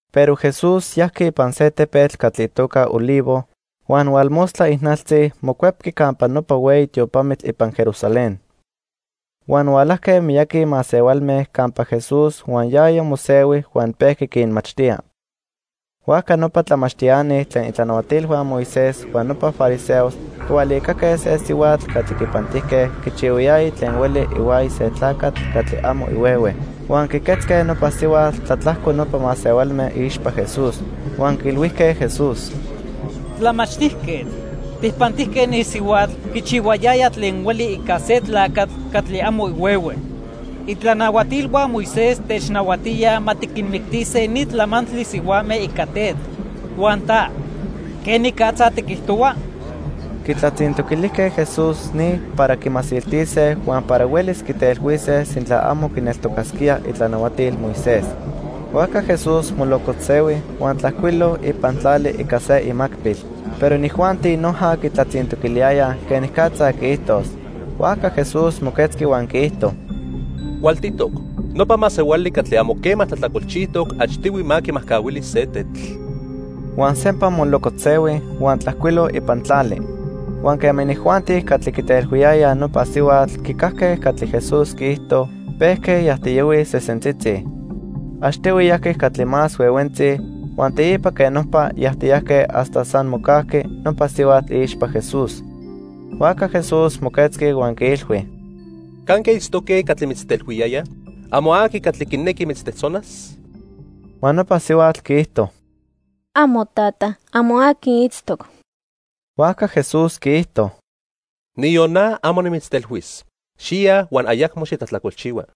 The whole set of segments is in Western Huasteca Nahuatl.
Pero Jesús yajqui ipan se tepetl catli itoca Olivo, huan hualmostla ijnaltzi mocuepqui campa nopa hueyi tiopamitl ipan Jerusalén. Huan hualajque miyaqui masehualme campa Jesús huan yaya mosehui huan pejqui quinmachtía. Huajca nopa tlamachtiani tlen itlanahuatilhua Moisés huan nopa fariseos quihualicaque se sihuatl catli quipantijque quichihuayaya tlen hueli ihuaya se tlacatl catli amo ihuehue. Huan quiquetzque nopa sihuatl tlatlajco nopa masehualme iixpa Jesús. Huan quiilhuijque Jesús: —Tlamachtijquetl, tijpantijque ni sihuatl quichihuayaya tlen hueli ica se tlacatl catli amo ihuehue. Itlanahuatilhua Moisés technahuatíaj ma tiquinmictise ni tlamantli sihuame ica tetl. Huan ta, ¿quenicatza tiquijtohua? Quitlatzintoquilijque Jesús ni para quimasiltise huan para huelis quitelhuise sintla amo quineltocasquía itlanahuatil Moisés. Huajca Jesús molocotzsehui huan tlajcuilo ipan tlali ica se imacpil. Pero inijuanti noja quitlatzintoquiliyayaj quenicatza quiijtos. Huajca Jesús moquetzqui huan quiijto: —Cualtitoc. Nopa masehuali catli amo quema tlajtlacolchijtoc achtihui ma quimajcahuili se tetl. Huan sempa molocotzsehui huan tlajcuilo ipan tlali. Huan quema inijuanti catli quitelhuiyayaj nopa sihuatl quicajque catli Jesús quiijto, pejque yajtiyohuij sesentzitzi. Achtihui yajqui catli más huehuentzi huan teipa quej nopa yajtiyajque hasta san mocajqui nopa sihuatl iixpa Jesús. Huajca Jesús moquetzqui huan quiilhui: —¿Canque itztoque catli mitztelhuiyayaj? ¿Amo aqui catli quinequi mitztejtzonas? Huan nopa sihuatl quiijto: —Amo, tata, amo aqui itztoc. Huajca Jesús quiijto: —Niyon na amo nimitztelhuis. Xiya huan ayacmo xitlajtlacolchihua.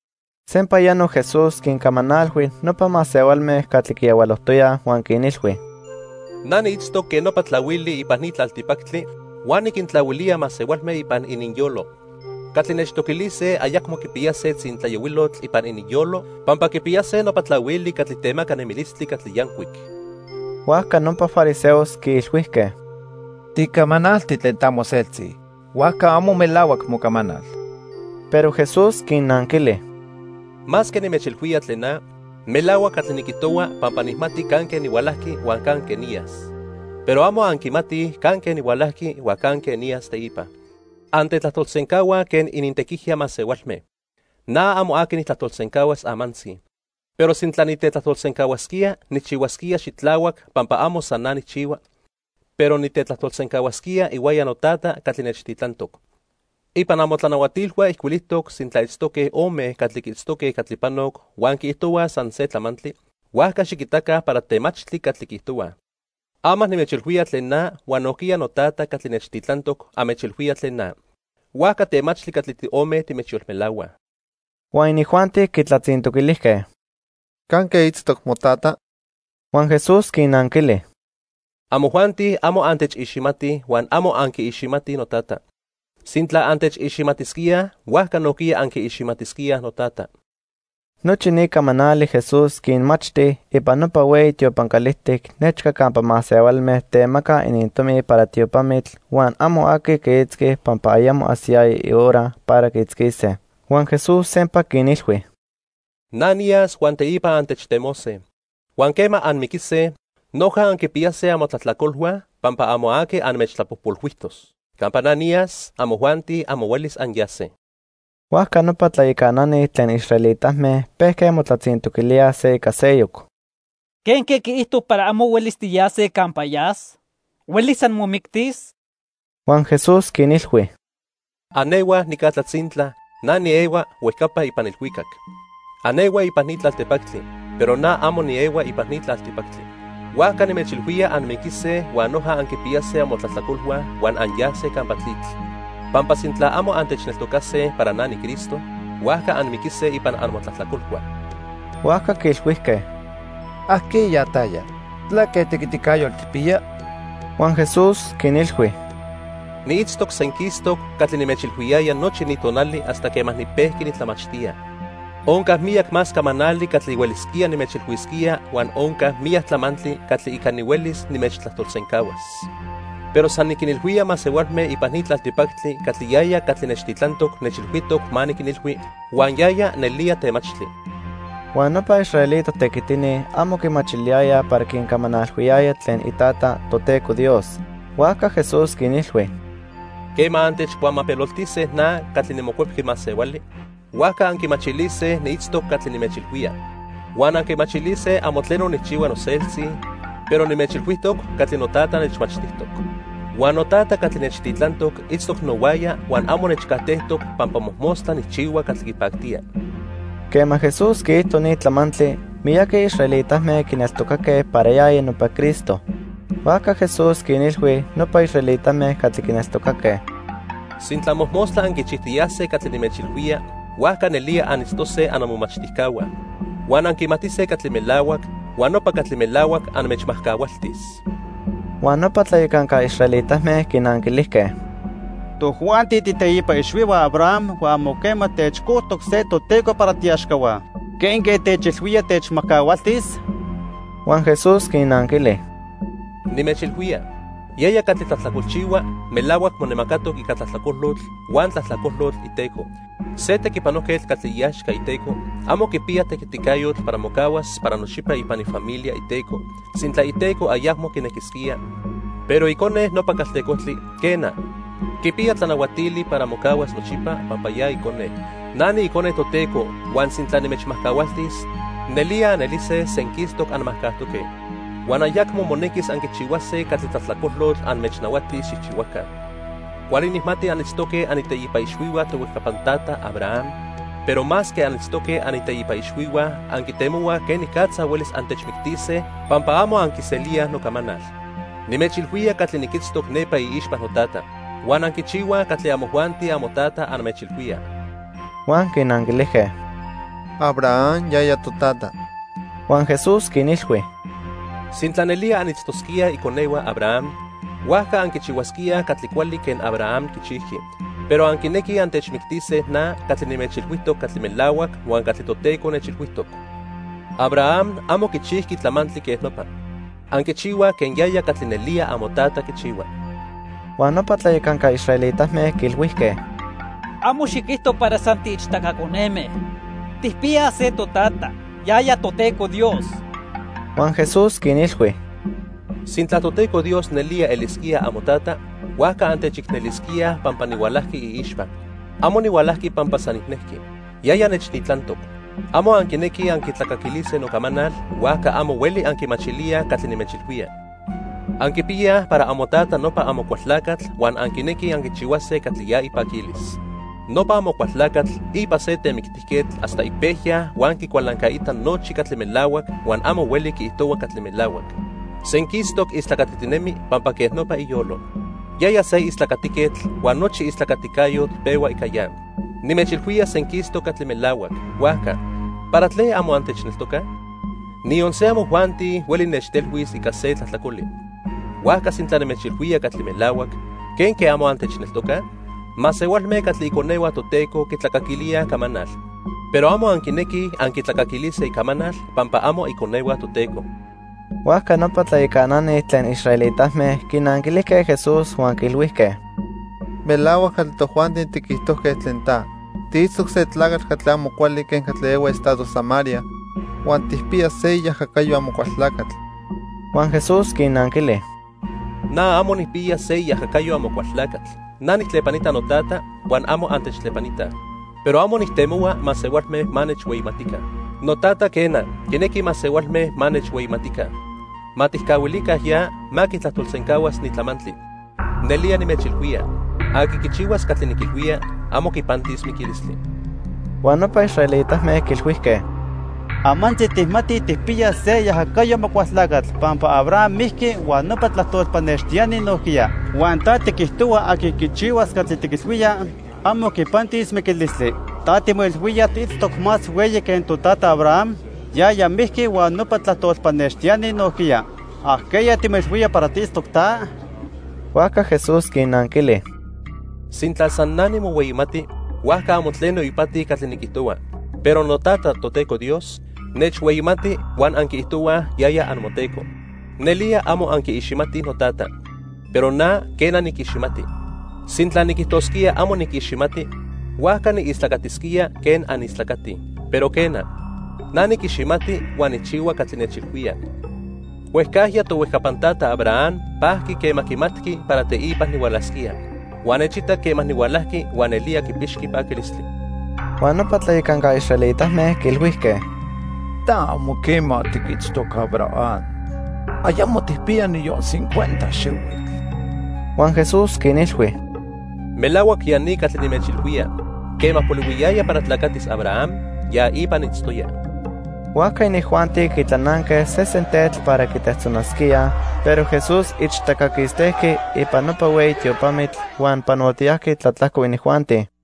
Sempayano Jesús quincamanalhui nopa masehualme catli quiyahualojtoyaj huan quinilhui: —Na niitztoc quen nopa tlahuili ipan ni tlaltipactli huan niquintlahuilía masehualme ipan ininyolo. Catli nechtoquilise ayacmo quipiyase tzintlayohuilotl ipan ininyolo pampa quipiyase nopa tlahuili catli temaca nemilistli catli yancuic. Huajca nopa fariseos quiilhuijque: —Ticamanalti tlen ta moseltzi, huajca amo melahuac mocamanal. Pero Jesús quinnanquili: —Masque nimechilhuía tlen na, melahuac catli niquijtohua pampa nijmati canque nihualajqui huan canque niyas. Pero amo anquimatij canque nihualajqui huan canque niyas teipa. Antetlajtolsencahuaj quen inintequijya masehualme. Na amo aqui nijtlajtolsencahua amantzi. Pero sintla nitetlajtolsencahuasquía, nijchihuasquía xitlahuac pampa amo san na nijchihua, pero nitetlajtolsencahuasquía ihuaya noTata catli nechtitlantoc. Ipan amotlanahuatilhua ijcuilijtoc sintla itztoque ome catli quiitztoque catli panoc huan quiijtohuaj san se tlamantli, huajca xiquitaca para temachtli catli quiijtohuaj. Ama nimechilhuía tlen na huan nojquiya noTata catli nechtitlantoc anmechilhuía tlen na, huajca temachtli catli tiome timechyolmelahuaj. Huan inijuanti quitlatzintoquilijque: —¿Canque itztoc motata? Huan Jesús quinnanquili: —Amojuanti amo antechiximatij huan amo anquiiximatij noTata. Sintla antechiximatisquíaj, huajca nojquiya anquiiximatisquíaj noTata. Nochi ni camanali Jesús quinmachti ipan nopa hueyi tiopan calijtic nechca campa masehualme temacaj inintomi para tiopamitl, huan amo aqui quiitzqui pampa ayamo ajsiyaya ihora para quiitzquise. Huan Jesús sempa quinilhui: —Na niyas huan teipa antechtemose. Huan quema anmiquise, noja anquipiyase amotlajtlacolhua pampa amo aqui anmechtlapojpolhuijtos. Campa na niyas, amojuanti amo huelis anyase. Huajca nopa tlayacanani tlen israelitame pejque motlatzintoquilíaj se ica seyoc: —¿Quenque quiijto para amo huelis tiyase campa yas? ¿Huelis san momictis? Huan Jesús quinilhui: —Anehuaj nica tlatzintla, na niehua huejcapa ipan ilhuicac. Anehuaj ipan ni tlaltipactli, pero na amo niehua ipan ni tlaltipactli. Huajca nimechilhuía anmiquise huan noja anquipiyase amotlajtlacolhua huan anyase campa tlitl. Pampa sintla amo antechneltocase para na niCristo, huajca anmiquise ipan anmotlajtlacolhua. Huajca quiilhuijque: —¿Ajqueya taya? ¿Tlaque tequiticayotl tijpiya? Huan Jesús quinilhui: —Niitztoc senquistoc catli nimechilhuiyaya nochi ni tonali hasta quema nipejqui nitlamachtía. Onca miyac más camanali catli huelisquía nimechilhuisquía huan onca miyac tlamantli catli ica nihuelis nimechtlajtolsencahuas. Pero san niquinilhuía masehualme ipan ni tlaltipactli catli yaya catli nechtitlantoc nechilhuijtoc ma niquinilhui, huan yaya nelía temachtli. Huan nopa israelita tequitini amo quimachiliyayaj para quincamanalhuiyaya tlen iTata, Toteco Dios. Huajca Jesús quinilhui: —Quema antechcuamapeloltise na catli niMocuepqui Masehuali, huajca anquimachilise niitztoc catli nimechilhuía. Huan anquimachilise amo tleno nijchihua noseltzi, pero nimechilhuijtoc catli noTata nechmachtijtoc. Huan noTata catli nechtitlantoc itztoc nohuaya huan amo nechcajtejtoc pampa mojmostla nijchihua catli quipactía. Quema Jesús quiijto ni tlamantli, miyaqui israelitame quineltocaque para yaya nopa Cristo. Huajca Jesús quinilhui nopa israelitame catli quineltocaque: —Sintla mojmostla anquichijtiyase catli nimechilhuía, huajca nelía anitztose annomomachtijcahua. Huan anquimatise catli melahuac, huan nopa catli melahuac anmechmajcahualtis. Huan nopa tlayacanca israelitame quinanquilijque: —Tojuanti tiiteipa ixhuihua Abraham huan amo quema techcojtoc se toteco para tiiaxcahua. ¿Quenque techilhuía techmajcahualtis? Huan Jesús quinnanquili: —Nimechilhuía, yaya catli tlajtlacolchihua melahuac monemacatoc ica tlajtlacolotl huan tlajtlacolotl iteco. Se tequipanojquetl catli iaxca iteco amo quipiya tequiticayotl para mocahuas para nochipa ipan ifamilia iteco sintla iteco ayacmo quinequisquía; pero icone nopa caltecojtli, quena, quipiya tlanahuatili para mocahuas nochipa pampa ya icone. Na niIcone Toteco huan sintla nimechmajcahualtis, nelía anelise senquistoc anmajcajtoque. Huan ayacmo monequis anquichihuase catli tlajtlacolotl anmechnahuatis xijchihuaca. Cuali nijmati anitztoque aniteipa ixhuihua tohuejcapan tata Abraham, pero masque anitztoque aniteipa ixhuihua, anquitemohuaj quenicatza huelis antechmictise pampa amo anquiselíaj nocamanal. Nimechilhuía catli niquitztoc nepa iixpa noTata. Huan anquichihuaj catli amojuanti amotata anmechilhuía. Huan quinanquilijque: —Abraham yaya totata. Huan Jesús quinilhui: —Sintla nelía anitztosquíaj iconehua Abraham, huajca anquichihuasquíaj catli cuali quen Abraham quichijqui. Pero anquinequij antechmictise na catli nimechilhuijtoc catli melahuac huan catli Toteco nechilhuijtoc. Abraham amo quichijqui tlamantli quen nopa. Anquichihuaj quen yaya catli nelía amotata quichihua. Huan nopa tlayacanca israelitame quiilhuijque: —Amo xiquijto para san tiichtaca coneme. Tijpiyaj se totata, yaya Toteco Dios. Huan Jesús quinilhui: —Sintla Toteco Dios nelía elisquía amotata, huajca antechicnelisquíaj pampa nihualajqui iixpa. Amo nihualajqui pampa san nijnejqui. Yaya nechtitlantoc. Amo anquinequij anquitlacaquilise nocamanal, huajca amo hueli anquimachilíaj catli nimechilhuía. Anquipiyaj para amotata nopa Amocualtlacatl huan anquinequij anquichihuase catli ya ipaquilis. Nopa Amocualtlacatl ipa se temictijquetl hasta ipejya huan quicualancaita nochi catli melahuac huan amo hueli quiijtohua catli melahuac. Senquistoc istlacatitinemi pampa quej nopa iyolo. Yaya se istlacatiquetl huan nochi istlacaticayotl pehua ica ya. Nimechilhuía senquistoc catli melahuac, huajca ¿para tlen amo antechneltocaj? Niyon se amojuanti hueli nechtelhuis ica se tlajtlacoli. Huajca sintla nimechilhuía catli melahuac, ¿quenque amo antechneltocaj? Masehualme catli iconehua Toteco quitlacaquilíaj icamanal, pero amo anquinequij anquitlacaquilise icamanal pampa amo iconehua Toteco. Huajca nopa tlayacanani tlen israelitame quinanquilijque Jesús huan quiilhuijque: —Melahuac catli tojuanti tiquijtojque tlen ta. Tiitztoc se tlacatl catli amo cuali quen catli ehua estado Samaria huan tijpiya se iajacayo Amocualtlacatl. Huan Jesús quinnanquili: —Na amo nijpiya se iajacayo Amocualtlacatl. Na nijtlepanita noTata huan amo antechtlepanitaj. Pero amo nijtemohua masehualme ma nechhueyimatica. NoTata, quena, quinequi masehualme ma nechhueyimatica. Ma tijcahuilica ya ma quitlajtolsencahuas ni tlamantli. Nelía nimechilhuía, aqui quichihuas catli niquilhuía, amo quipantis miquilistli. Huan nopa israelitame quiilhuijque: —Amantzi tijmatij tijpiya se iajacayo Amocualtlacatl pampa Abraham mijqui huan nopa tlajtol pannextiani nojquiya. Huan ta tiquijtohua aqui quichihuas catli tiquilhuía, amo quipantis miquilistli. Ta timoilhuía tiitztoc más hueyi que totata Abraham. Yaya mijqui huan nopa tlajtol pannextiani nojquiya. ¿Ajqueya timoilhuía para tiitztoc ta? Huajca Jesús quinnanquili: —Sintla san na nimohueyimati, huajca amo tleno ipati catli niquijtohua. Pero noTata, Toteco Dios, nechhueyimati huan anquiijtohuaj yaya amoTeco. Nelía amo anquiiximatij noTata. Pero na, quena, niquiximati. Sintla niquijtosquía amo niquiximati, huajca niistlacatisquía quen anistlacatij. Pero, quena, na niquiximati huan nijchihua catli nechilhuía. Huejcajya tohuejcapan tata Abraham pajqui quema quimatqui para teipa nihualasquía, huan nechitac quema nihualajqui huan nelía quipixqui paquilistli. Huan nopa tlayacanca israelitame quiilhuijque: —Ta amo quema tiquitztoc Abraham. Ayamo tijpiya niyon cincuenta xihuitl. Huan Jesús quinilhui: —Melahuac ya ni catli nimechilhuía, quema polihuiyaya para tlacatis Abraham, ya ipa niitztoya. Huajca inijuanti quitlananque sesen tetl para quitejtzonasquíaj, pero Jesús ichtaca quistejqui ipan nopa hueyi tiopamitl huan panotiyajqui tlatlajco inijuanti.